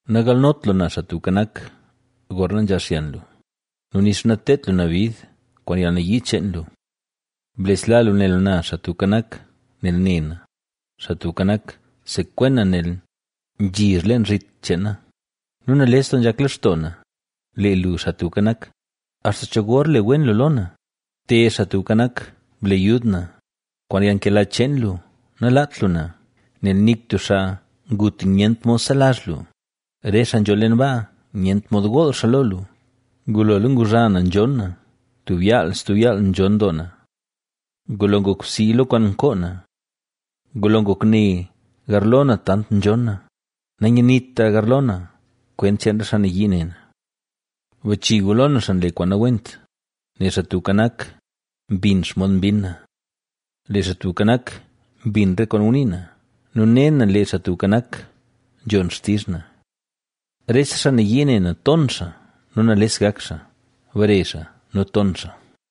Nagalnot lu na, Xaa Tubka Nak, gorna nzhaal xyan lu nu nixa nateedt lu na bid kwaan yalnayii cheen lu. Blesla lu ne lu na, Xaa Tubka Nak, nel ne na; Xaa Tubka Nak, sekwen na nel nzhizh leen zhit cheen na. Nu nales doo nzhak lextoo na, lee lu, Xaa Tubka Nak, ¿axta cho gor le wen lu lo na? ¡Te, Xaa Tubka Nak, ble yud na, kwaan yalnkela cheen lu, nalaat lu na! Nel nik tub xaa ngut nyent mod selazh lu; re xaa nzho leen baa, nyent mod gool xaa lo lu. Ngulola nguzha na nzhonn na; tub yaal stub yaal nzhonn doo na, ngulo ngok bsii lo kwaan nkoo na. Ngulo ngok ne garlo na tant nzhonn na; nanyanitra garlo na kwent cheen re xaa nayii ne na. Bachi gu lo na xaa nle kwaan nawent, nel Xaa Tubka Nak, mbin xomod mbinn na. Lee Xaa Tubka Nak, mbin re kwaan ngunii na nu ne na lee Xaa Tubka Nak, nzhon xtizh na. Rese xaa nayii ne na ton xaa nu nales gak xaa; bare xaa nu ton xaa.